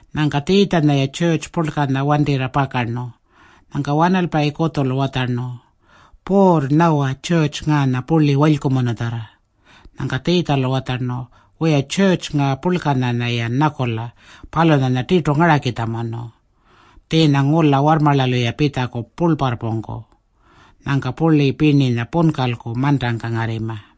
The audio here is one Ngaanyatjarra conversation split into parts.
Nyangka Tjiitjanya-ya tjurrtju purlkanya wantirra pakarnu. Nyangka wanalpayi kutjulu watjarnu, “Puurr, nyawa tjurrtju ngaanya purli walykumunutjarra.” Nyangka Tjiitjalu watjarnu, “Wiya, tjurrtju ngaa purlkanya-yan nyakula, palunyanya tirtu ngarakitjamunu. Tjiinya ngula warrmarlalu-ya pitjaku purlparrpungku. Nyangka purli pirninya punkalku mantangka ngarrima.”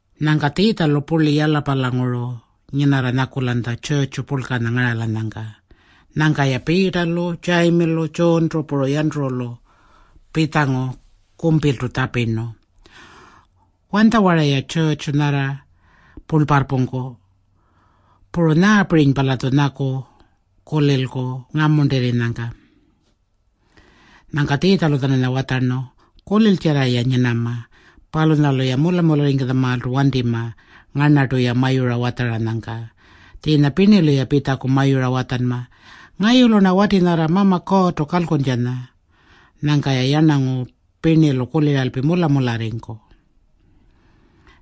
Nyangka Tjiitjalu purli Yalapalanguru nyinarra nyakulanytja tjurrtju purlkanya ngaralanyangka. Nyangka-ya Piitalu, Tjayimilu, Tjuuntu, puru Yanturulu pitjangu kumpiltu tjapirnu, “Wanytjawara-ya tjurrtju nyarranya purlparrpungku? Puru nyaapirinypa-latju nyaku kulilku ngamuntirrinyangka?” Nyangka Tjiitjalu-tjananya watjarnu, “Kuliltjarra-ya nyinama. Palunyalu-ya mula-mularringkutjamaaltu wantima ngarnartu-ya mayura watjaranyangka. Tjiinya pirnilu-ya pitjaku mayura watjanma, ‘Ngayulu-rna wati nyarra Mama Kuurrtu kalkuntjanya.’ Nyangka-ya yarnangu pirnilu kuliralpi mula-mularringku.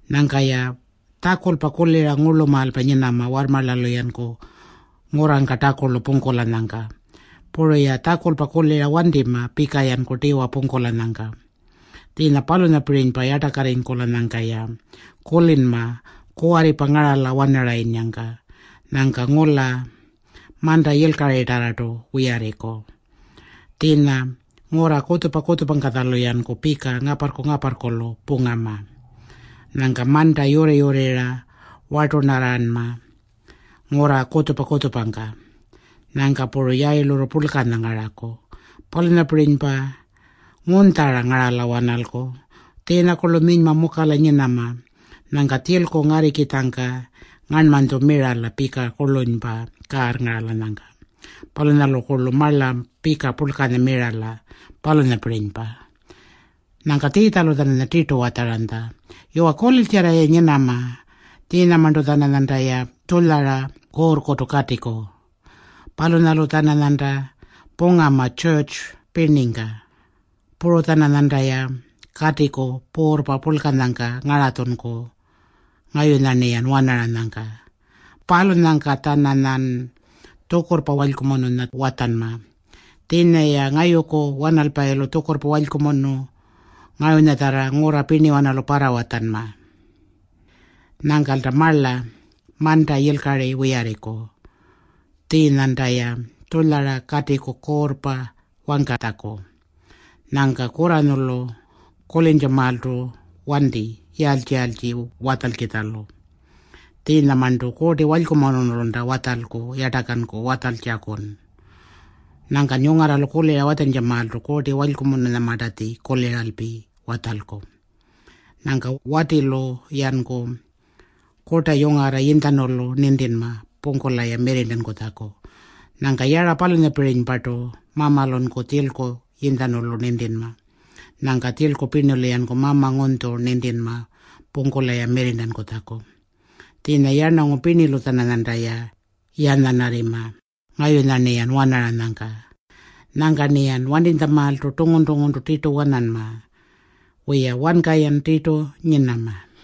Nyangka-ya tjakulpa kulira ngurlumaalpa nyinama warrmarlalu-yanku ngurrangka takulu pungkulanyangka. Puru-ya tjakulpa kulira wantima pika-yanku tiwa pungkulanyangka. Tjiinya palunyapirinypa yartakarringkulanyangka-ya kulinma kuwarripa ngarala-wanarayinnyangka. Nyangka ngula manta yilkaritarrartu wiyarriku. Tjiinya ngurra kutjupa-kutjupangkatjalu-yanku pika ngaparrku-ngaparrkulu pungama. Nyangka manta yurri-yurrirra wartunarranma ngurra kutjupa-kutjupangka. Nyangka puru yayilurru purlkanya ngaraku. Palunyapirinypa ngunytjara ngarala-wanalku. Tjiinyakurlu minyma mukala nyinama. Nyangka tjilku ngarrikitjangka ngarnmanytju mirala pika kurlunypa kaarrngaralanyangka. Palunyalukurlu marla pika purlkanya mirala, palunyapirinypa.” Nyangka Tjiitjalu-tjananya tirtu watjaranytja, “Yuwa, kuliltjarra-ya nyinama. Tjiinyamarntu-tjananyantaya tjulyara kuurrkutu katiku. Palunyalu-tjananyanta pungama tjurrtju pirningka. Puru-tjananyantaya katiku puurrpa purlkanyangka ngaratjunku ngayunya-rniyan wanaranyangka. Palunyangka-tjananyan tjukurrpa walykumununya watjanma. Tjiinya-ya ngayuku wanalpayilu tjukurrpa walykumunu ngayunyatjarra ngurra pirniwanalu parrawatjanma. Nyangkalta marla manta yilkari wiyarriku. Tjiinyanta-ya tjulyara katiku kuurrpa wangkatjaku. Nyangka kurranyulu kulintjamaaltu wanti yaaltji-yaaltji watjalkitjalu. Tjiinyamarntu Kuurti Walykumunulunta watjalku yartakanku watjaltjakun. Nyangkan yungarralu kulira watjantjamaaltu Kuurti Walykumununyamartatji kuliralpi watjalku. Nyangka watilu-yanku kurta yungarra yinytjanulu nintinma pungkula-ya mirrirntankutjaku. Nyangka yara palunyapirinypartu mamalunku tjilku yinytjanulu nintinma. Nyangka tjilku pirnilu-yanku mama ngunytju nintinma pungkula-ya mirrirntankutjaku. Tjiinya yarnangu pirnilu-tjananyantaya yanyanarrima ngayunya-rniyan wanaranyangka. Nyangka-rniyan wantinytjamaaltu tungun-tunguntu tirtu wananma. Wiya, wanka-yan tirtu nyinama.”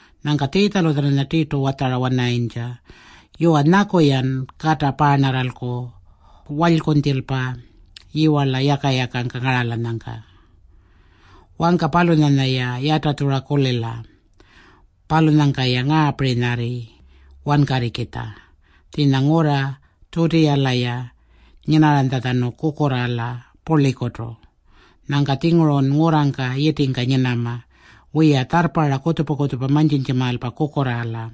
Nyangka Tjiitjalu-tjananya tirtu watjara-wanarayintja, “Yuwa, nyaku-yan kata paarnarralku walykunytjilpa yiwarla yaka-yakangka ngaralanyangka.” Wangka palunyanya-ya yatatjurra kulila. “Palunyangka-ya ngaapirinyarri wankarrikitja. Tjiinya ngurra Tjutiyala-ya nyinarranytjatjanu kukurraala purlikutu. Nyangka-tjingurun ngurrangka yitingka nyinama. Wiya, tjarrparra kutjupa-kutjupa mantjintjamaalpa kukurraala.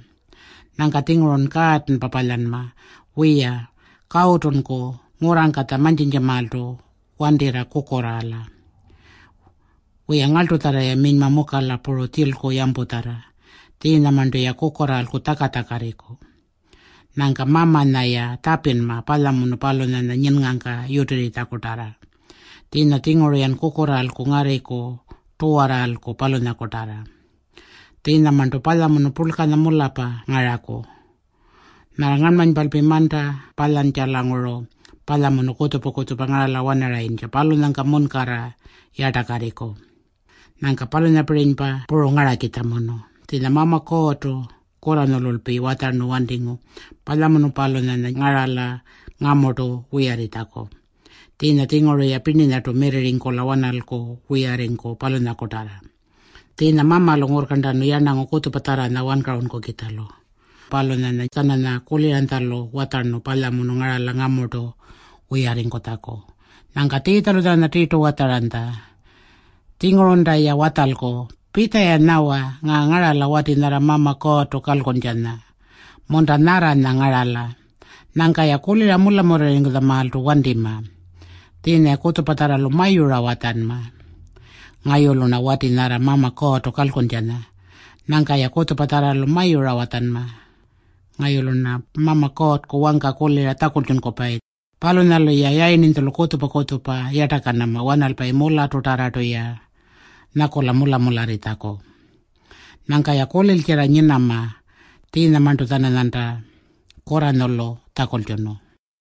Nyangka-tjingurun kaatanpa palyanma. Wiya, kawutunku ngurrangkatja mantjintjamaaltu wantirra kukurraala. Wiya, ngarltutjarra-ya minyma mukala puru tjilku yamputjarra. Tjiinyamarntu-ya kukurraalku tjaka-tjakarriku. Nyangka Mamanya-ya tjapinma palyamunu palunyanya nyinngangka yutirritjakutarra. Tjiinya-tjinguru-yan kukurraalku ngarriku tuwarraalku, palunyakutarra. Tjiinyamarntu palyamunu purlkanya mularrpa ngaraku. Nyarra ngarnmanypalpi manta palyantjalanguru palyamunu kutjupa-kutjupa ngarala-wanarayintja, palunyangka munkarra yartakarriku. Nyangka palunyapirinypa puru ngarakitjamunu. Tjiinya Mama Kuurrtu kurranyululpi watjarnu wantingu palyamunu palunyanya ngarala ngamurtu wiyarringkutjaku. Tjiinya-tjinguru-ya pirninyartu mirrirringkula-wanalku wiyarringku, palunyakutarra. Tjiinya Mamalu ngurrkarntanu yarnangu kutjupatjarranya wankarunkukitjalu. Palunyanya-tjananya kuliranytjalu watjarnu palyamunu ngarala ngamurtu wiyarringkutjaku.” Nyangka Tjiitjalu-tjananya tirtu watjaranytja, “Tjingurunta-ya watjalku, ‘Pitja-ya nyawa. Ngaa ngarala wati nyarra Mama Kuurrtu kalkuntjanya. Munta, nyarranya ngarala.’ Nyangka-ya kulira mula-mularringkutjamaaltu wantima. Tjiinya-ya kutjupatjarralu mayura watjanma, ‘Ngayulu-rna wati nyarra Mama Kuurrtu kalkuntjanya.’ Nyangka-ya kutjupatjarralu mayura watjanma, ‘Ngayulu-rna Mama Kuurrku wangka kulira tjakultjunkupayi.’ Palunyalu-ya yayirninytjulu kutjupa-kutjupa yartakanama wanalpayi mularrtutarrartu-ya nyakula mula-mularritjaku. Nyangka-ya kuliltjarra nyinama tjiinyamarntu-tjananyarnanta kurranyulu tjakultjunu.”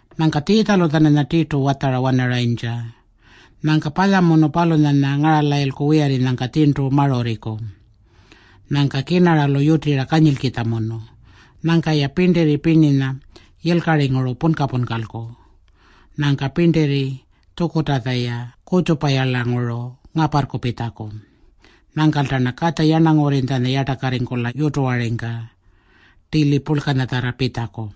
Nyangka Tjiitjalu-tjananya tirtu watjara-wanarayintja, “Nyangka palyamunu palunyanya ngaralayilku wiyarrinyangka tjirntu marurriku. Nyangka kirnaralu yutira kanyilkitjamunu. Nyangka-ya pirntirri yilkaringuru punka-punkalku. Nyangka pirntirri tjukurrtatja-ya kutjupayarlanguru ngaparrku pitjaku. Nyangkalta-rna Katja Yarnangurrinytjanya yartakarringkula yutuwaringka tili purlkanyatjarra pitjaku.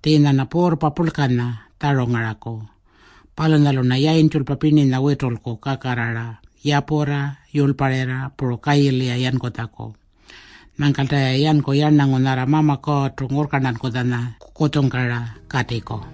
Tjiinya-rna puurrpa purlkanya tjarungaraku. Palunyalu-rna yayintjulpa pirninya witulku kakarrara yapurra yurlparirra puru kayili-ya yankutjaku. Nyangkalta-ya yanku yarnangu nyarra Mama Kuurrtu ngurrkarntankutjanya kutjungkara katiku.”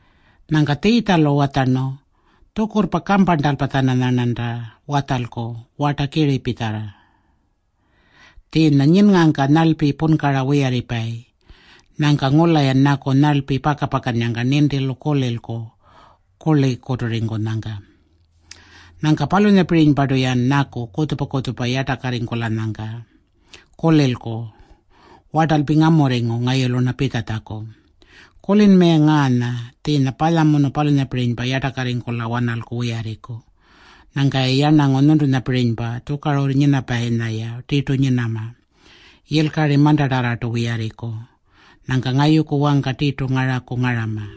Nyangka Tjiitjalu watjarnu, “Tjukurrpa kamparntalpa-tjananyarnanta watjalku warta kiripitjarra. Tjiinya nyinngangka nyarlpi punkara wiyarripayi. Nyangka ngula-yan nyaku nyarlpi paka-pakannyangka nintilu kulilku kurlikuturrinyangka. Nyangka palunyapirinypartu-yan nyaku kutjupa-kutjupa yartakarringkulanyangka kulilku wartalpi ngamurringu ngayulu-rna pitjatjaku. Kulinma-ya ngaanya. Tjiinya palyamunu palunyapirinypa yartakarringkula-wanalku wiyarriku. Nyangka-ya yarnangu nyuntunyapirinypa, tjukarurru nyinapayinya-ya tirtu nyinama. Yilkari mantatarrartu wiyarringku. Nyangka ngayuku wangka tirtu ngaraku ngarama.”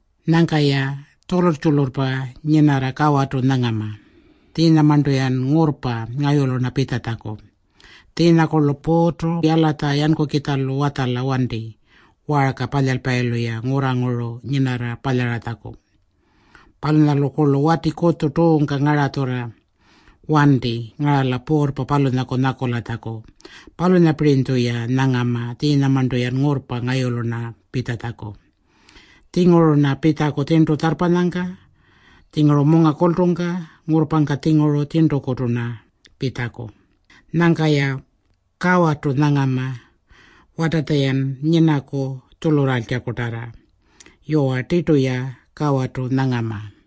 Nyangka-ya tjulurr-tjulurrpa nyinarra kawarrtu nyangama. Tjiinyamarntu-yan ngurrpa ngayulu-rna pitjatjaku. Tjiinyakurlu puurrtu yalatja yankukitjalu watjala wanti waarka palyalpayilu-ya ngurranguru nyinarra palyaratjaku. Palunyalukurlu wati kutju tuungka ngaratjurra wanti ngarala puurrpa palunyaku nyakulatjaku. Palunyapirinytju-ya nyangama tjiinyamarntu-yan ngurrpa ngayulu-rna pitjatjaku. Tjinguru-rna pitjaku tjirntu tjarrpanyangka, tjinguru munga kultungka. Ngurrpangka-tjinguru-rna tjirntukutu pitjaku. Nyangka-ya kawarrtu nyangama watatja-yan nyinaku tjulurraaltjakutarra. Yuwa, tirtu-ya kawarrtu nyangama.”